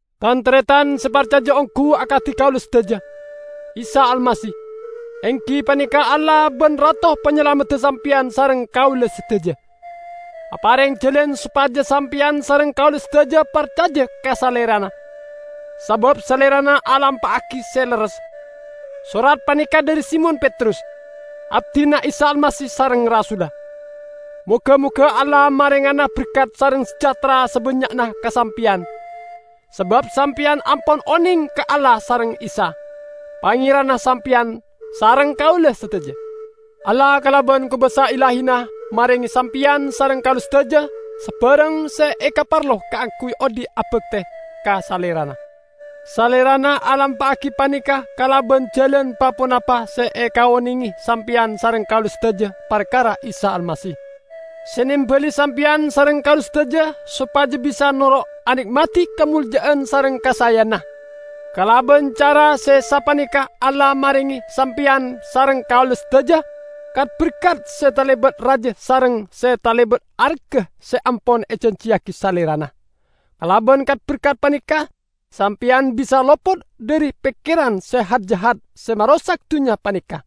Tan-taretan se parcaja onggu akadi kaula sadaja! Isa Almasih, enggi paneka Allah ban Rato Panyalamedda sampeyan sareng kaula sadaja, apareng jalan sopaja sampeyan sareng kaula sadaja parcaja ka Salerana, sabab Salerana alampa'agi se lerres. Sorat paneka dhari Simon Petrus, abdina Isa Almasih sareng rasulla. Moga-moga Allah marengana berkat sareng sejahtera sabannya'na ka sampeyan, sabab sampeyan ampon oneng ka Allah sareng Isa, Pangeranna sampeyan sareng kaula sadaja. Allah kalaban kobasa Illahina marenge sampeyan sareng kaula sadaja sabarang se ekaparlo kaangguy odhi' abakte ka Salerana. Salerana alampa'agi paneka kalaban jalan pa-ponapa se ekaonenge sampeyan sareng kaula sadaja parkara Isa Almasih, se nembali sampeyan sareng kaula sadaja sopaja bisa noro' ane'madi kamolja'an sareng kasaeyanna. Kalaban cara se sapaneka Allah marenge sampeyan sareng kaula sadaja kat-berkat se talebat raja sareng se talebat arga se ampon ejanjiyagi Salerana. Kalaban kat-berkat paneka sampeyan bisa lopot dhari pekkeran se hat-jahat se marosak dunnya paneka;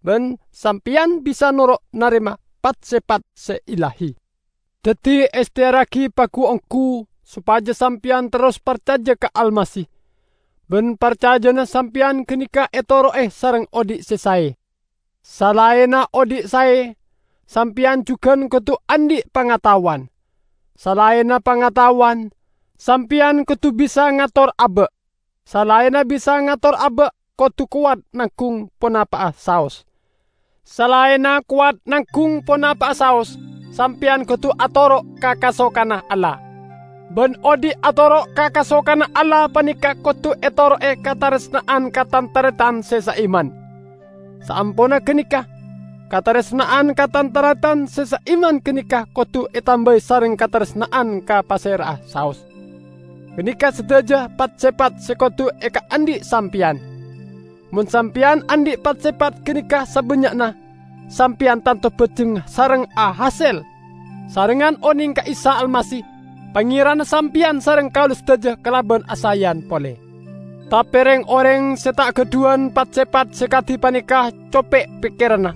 ban sampeyan bisa noro' narema pat-sepat se illahi. Daddi ehteyarragi pagu-onggu sopaja sampeyan terros parcaja ka Almasih, ban parcajana sampeyan ganeka etoro'e sareng odhi' se sae. Salaenna odhi' sae, sampeyan jugan kodu andhi' pangataowan, salaenna pangataowan, sampeyan kodu bisa ngator aba'. Salaenna bisa ngator aba' kodu kowat nanggung ponapa'a saos. Salaenna kowat nanggung ponapa'a saos, sampeyan kodu atoro' ka kasokanna Allah. Ban odhi' atoro' ka kasokanna Allah paneka kodu etoro'e kataresna'an ka tan-taretan se saiman. Saamponna ganeka, kataresna'an ka tan-taretan se saiman ganeka kodu etambai sareng kataresna'an ka pasera'a saos. Ganeka sadaja pat-sepat se kodu ekaandhi' sampeyan. Mon sampeyan andhi' pat-sepat ganeka sabannya'na, sampeyan tanto bajeng sareng ahasel, sarengngan oneng ka Isa Almasih Pangeranna sampeyan sareng kaula sadaja kalaban asaeyan pole. Tape reng-oreng se ta' gadhuwan pat-sepat se kadi paneka cope' pekkeranna,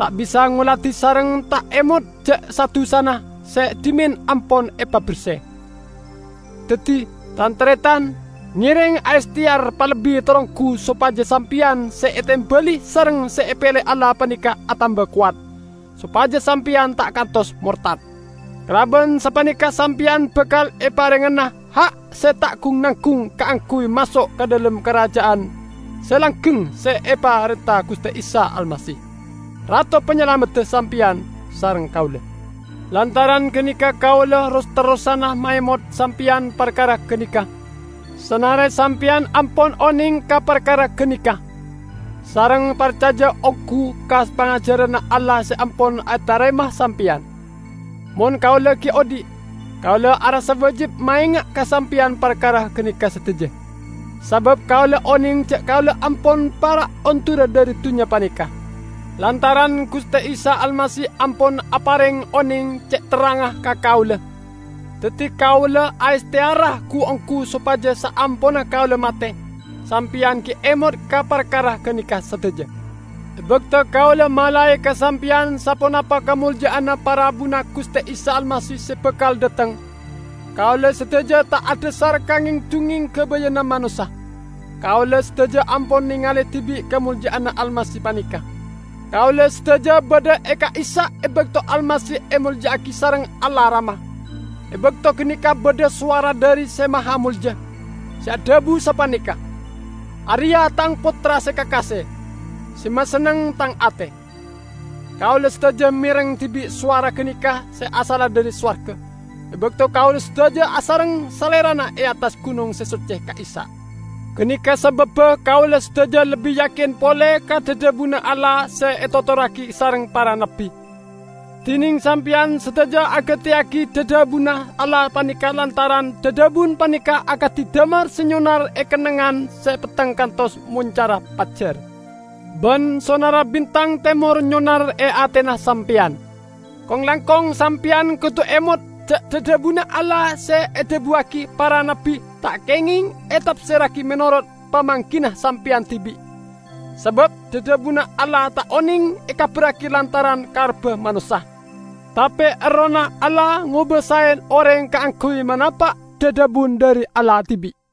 ta' bisa ngoladi sareng ta' emot ja' sa-dusana se dhimen ampon epaberse. Daddi, tan-taretan, ngereng aehteyar palebbi taronggu sopaja sampeyan se etembali sareng se epele Allah paneka atamba kowat, sopaja sampeyan ta' kantos mortad. Kalaban sapaneka sampeyan bakal eparengngana ha' se ta' gung-nanggung kaangguy maso' ka dhalem Karaja'an se langgeng se eparenta Guste Isa Almasih, Rato Panyalamedda sampeyan sareng kaula. Lantaran ganeka kaula ros-terrosana maemot sampeyan parkara ganeka, sanare sampeyan ampon oneng ka parkara ganeka, sareng parcaja onggu ka pangajaranna Allah se ampon etarema sampeyan. Mon kaula gi' odhi', kaula arassa wajib maenga' ka sampeyan parkara ganeka sadaja. Sabab kaula oneng ja' kaula ampon para' ondura dhari dunnya paneka, lantaran Guste Isa Almasih ampon apareng oneng ce' terrangnga ka kaula. Daddi kaula aehteyara gu-onggu sopaja saamponna kaula mate, sampeyan gi' emot ka parkara ganeka sadaja. E bakto kaula malae ka sampeyan saponapa kamolja'anna parabuna Guste Isa Almasih se bakal dhateng, kaula sadaja ta' adhasar ka ngeng-dungngeng gabayanna manossa. Kaula sadaja ampon nengale dibi' kamolja'anna Almasih paneka. Kaula sadaja badha e ka'issa' e bakto Almasih emolja'agi sareng Allah Rama; e bakto ganeka badha sowara dhari Se Mahamolja, se adhabu sapaneka, "Areya' Tang Pottra se kakase. Se masenneng Tang ate!" Kaula sadaja mereng dibi' sowara ganeka se asalla dhari sowarga, e bakto kaula sadaja asareng Salerana e attas gunong se socce ka'issa'. Ganeka sababba kaula sadaja lebbi yakin pole ka dhadhabunna Allah se etotorragi sareng para nabbi. Dineng sampeyan sadaja agateyagi dhadhabunna Allah paneka lantaran dhadhabun paneka akadi damar se nyonar e kennengngan se petteng kantos moncarra pajjar, ban sonarra bintang temor nyonar e atena sampeyan. Kong-langkong sampeyan kodu emot ja' dhadhabunna Allah se edhabuwagi para nabbi ta' kengeng etapserragi menorot pamanggina sampeyan dibi'. Sabab dhadhabunna Allah ta' oneng ekabarragi lantaran karebba manossa. Tape Errohna Allah ngobasae oreng kaangguy manapa' dhadhabun dhari Allah dibi'.